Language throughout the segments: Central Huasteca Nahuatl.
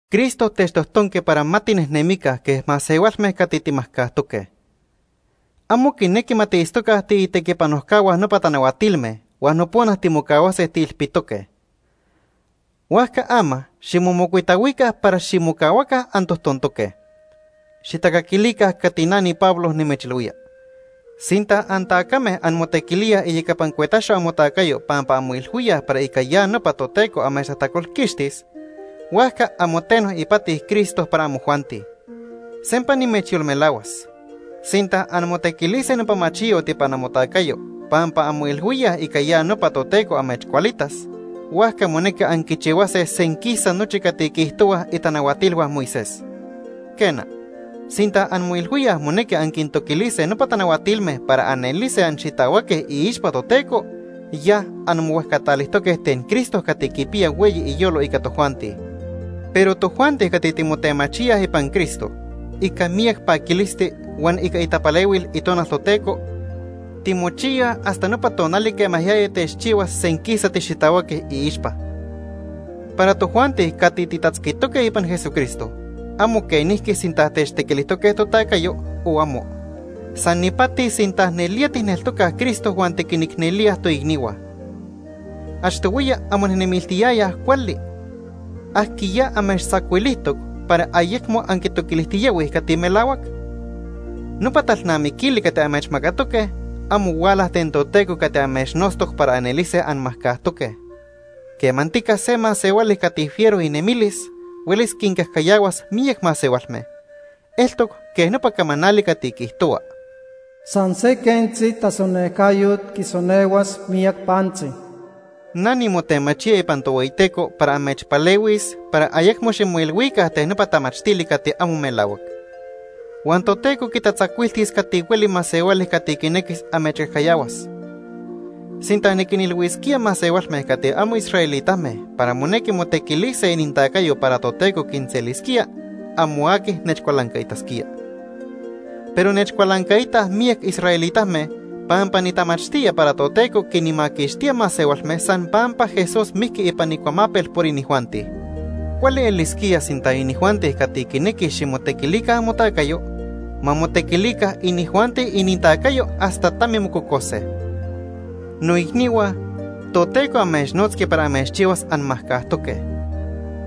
Cristo techtojtonqui para ma tinejnemica quej masehualme cati timajcajtoque. Amo quinequi ma tiitztoca tiitequipanojcahua nopa tanahuatilme huan nopona timocahuase tiilpitoque. Huajca ama ximomocuitahuica para ximocahuaca antojtontoque. Xijtacaquilica cati na niPablo nimechilhuía. Sinta antacame anmotequilíaj iyecapa cuetaxo amotacayo pampa anmoilhuíaj para ica ya nopa Toteco amechtajtacolquixtis ten amotajtacolhua, huajca amo teno ipati Cristo para amojuanti. Sempa nimechyolmelahuas, sinta anmotequilise nopa machiyot ipan amotacayo pampa anmoilhuíaj ica ya nopa Toteco amechcualitas, huajca monequi anquichihuase senquisa nochi cati quiijtohuaj itanahuatilhua Moisés. Quena, sinta anmoilhuíaj monequi anquintoquilise nopa tanahuatilme para anelise anxitahuaque iixpa Toteco, ya anmohuejcatalijtoque ten Cristo cati quipiya hueyi iyolo ica tojuanti. Pero tojuanti cati timotemachíaj ipan Cristo, ica miyac paquilisti huan ica itapalehuil Itonal Toteco timochiyaj hasta nopa tonali quema yaya techchihuas senquisa tixitahuaque iixpa. Para tojuanti cati titatzquitoque ipan Jesucristo, amo quenijqui sinta techtequilijtoque totacayo o amo. San ipati sinta nelía tijneltocaj Cristo huan tiquinicnelíaj toicnihua. Achtohuiya anmonejnemiltiyayaj cuali. ¿Ajquiya amechtzacuilijtoc para ayecmo anquitoquilijtiyahuij cati melahuac? Nopa talnamiquili cati amechmacatoque, amo huala ten Toteco cati amechnotztoc para anelise anmajcajtoque. Quemantica se masehuali cati fiero inemilis huelis quincajcayahuas miyac masehualme. Eltoc quej nopa camanali cati quiijtohua: “San se quentzi tasonejcayot quisonehuas miyac pantzi.” Na nimotemachía ipan Tohueyiteco para amechpalehuis para ayecmo ximoilhuica ten nopa tamachtili cati amo melahuac. Huan Toteco quitatzacuiltis cati hueli masehuali cati quinequis amechcajcayahuas. Sinta niquinilhuisquía masehualme cati amo israelitame para monequi motequilise inintacayo para Toteco quinselisquía, amo aqui nechcualancaitasquía. Pero nechcualancaitaj miyac israelitame pampa nitamachtía para Toteco quinmaquixtía masehualme san pampa Jesús mijqui ipan icuamapel por inijuanti. Cuali elisquía sinta inijuanti cati quinequij ximotequilica amotacayo, ma motequilica inijuanti inintacayo hasta tami mococose. Noicnihua, Toteco amechnotzqui para amechchihuas anmajcajtoque.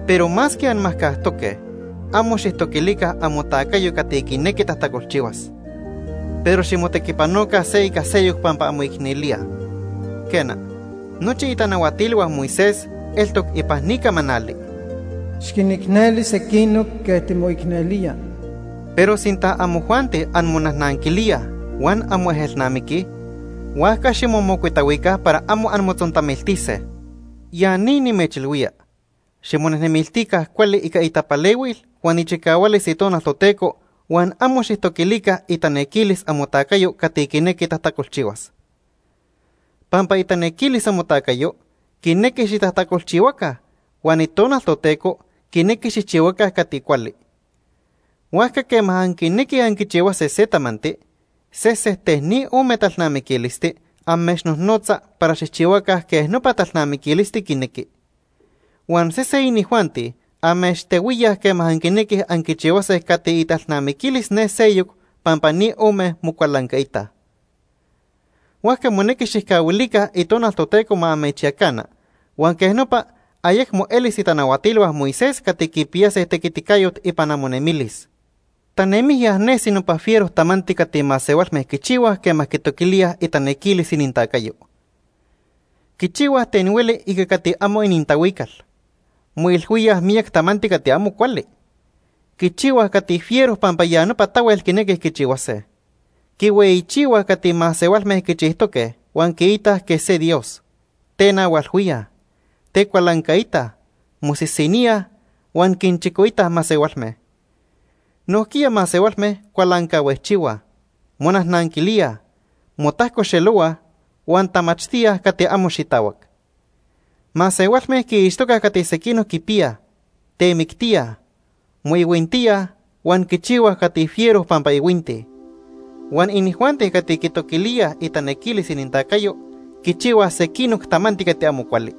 Pero masque anmajcajtoque, amo xijtoquilica amotacayo cati quinequi tajtacolchihuas. Pero ximotequipanoca se ica seyoc pampa anmoicnelíaj. Quena, nochi itanahuatilhua Moisés eltoc ipan ni camanali: “Xiquinicneli sequinoc quej timoicnelía.” Pero sinta amojuanti anmonajnanquilíaj huan anmoejelnamiquij, huajca ximomocuitahuica para amo anmotzontamiltise. Ya ni nimechilhuía: Ximonejnemiltica cuali ica itapalehuil huan ichicahualis Itonal Toteco huan amo xijtoquilica itanequilis amotacayo cati quinequi tajtacolchihuas. Pampa itanequilis amotacayo quinequi xitajtacolchihuaca, huan Itonal Toteco quinequi xijchihuaca cati cuali. Huajca quema anquinequij anquichihuase se tamanti, sesen ten ni ome talnamiquilisti amechnojnotza para xijchihuaca quej nopa talnamiquilisti quinequi. Huan sesen inijuanti amechtehuíaj quema anquinequij anquichihuase cati italnamiquilis ne seyoc pampa ni ome mocualancaitaj. Huajca monequi xijcahuilica Itonal Toteco ma amechyacana, huan quej nopa ayecmo elis itanahuatilhua Moisés cati quipiyase tequiticayot ipan amonemilis. Tanemijya nesi nopa fiero tamanti cati masehualme quichihuaj quema quitoquilíaj itanequilis inintacayo. Quichihuaj ten hueli ica cati amo inintahuical. Moilhuíaj miyac tamanti cati amo cuali. Quichihuaj cati fiero pampa ya nopa tahuel quinequij quichihuase. Quihueyichihuaj cati masehualme quichijtoque huan quiitaj quej se dios. Tenahualhuíaj, tecualancaitaj, mosisiníaj, huan quinchicoitaj masehualme. Nojquiya masehualme cualancahuejchihuaj, monajnanquilíaj, motajcoxelohuaj, huan tamachtíaj cati amo xitahuac. Masehualme quiixtocaj cati sequinoc quipiyaj, temictíaj, moihuintíaj huan quichihuaj cati fiero pampa ihuintij. Huan inijuanti cati quitoquilíaj itanequilis inintacayo quichihuaj sequinoc tamanti cati amo cuali.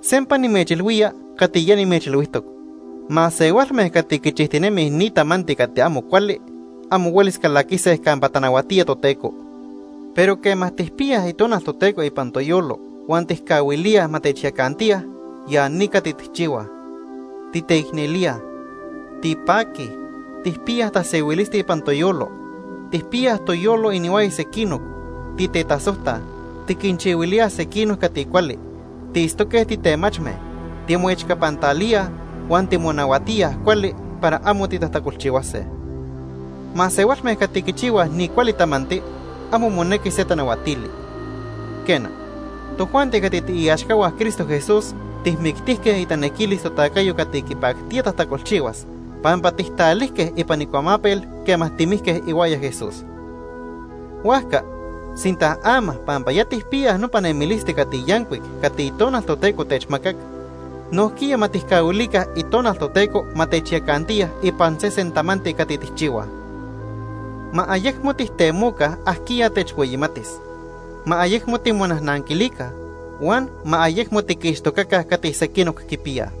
Sempa nimechilhuía cati ya nimechilhuijtoc. Masehualme cati quichijtinemij ni tamanti cati amo cuali, amo huelis calaquise campa tanahuatía Toteco. Pero quema tijpiyaj Itonal Toteco ipan toyolo huan tijcahuilíaj ma techyacantiya, ya ni cati tijchihuaj: Titeicnelíaj, tipaquij, tijpiyaj tasehuilisti ipan toyolo, tijpiyaj toyolo inihuaya sequinoc, titetasojtaj, tiquinchihuilíaj sequinoc cati cuali, tiitztoque titemachme, timoechcapantalíaj huan timonahuatíaj cuali para amo titajtacolchihuase. Masehualme cati quichihuaj ni cuali tamanti amo monequi se tanahuatili. Quena, tojuanti cati tiiaxcahua Cristo Jesús tijmictijque itanequilis totacayo cati quipactía tajtacolchihuas pampa tijtalijque ipan icuamapel quema timijque ihuaya Jesús. Huajca, sinta ama pampa ya tijpiyaj nopa nemilisti cati yancuic cati Itonal Toteco techmacac, nojquiya ma tijcahuilica Itonal Toteco ma techyacantiya ipan sesen tamanti cati tijchihuaj. Ma ayecmo tijtemoca ajquiya techhueyimatis. Ma ayecmo timonajnanquilica. Huan ma ayecmo tiquixtocaca cati sequinoc quipiyaj.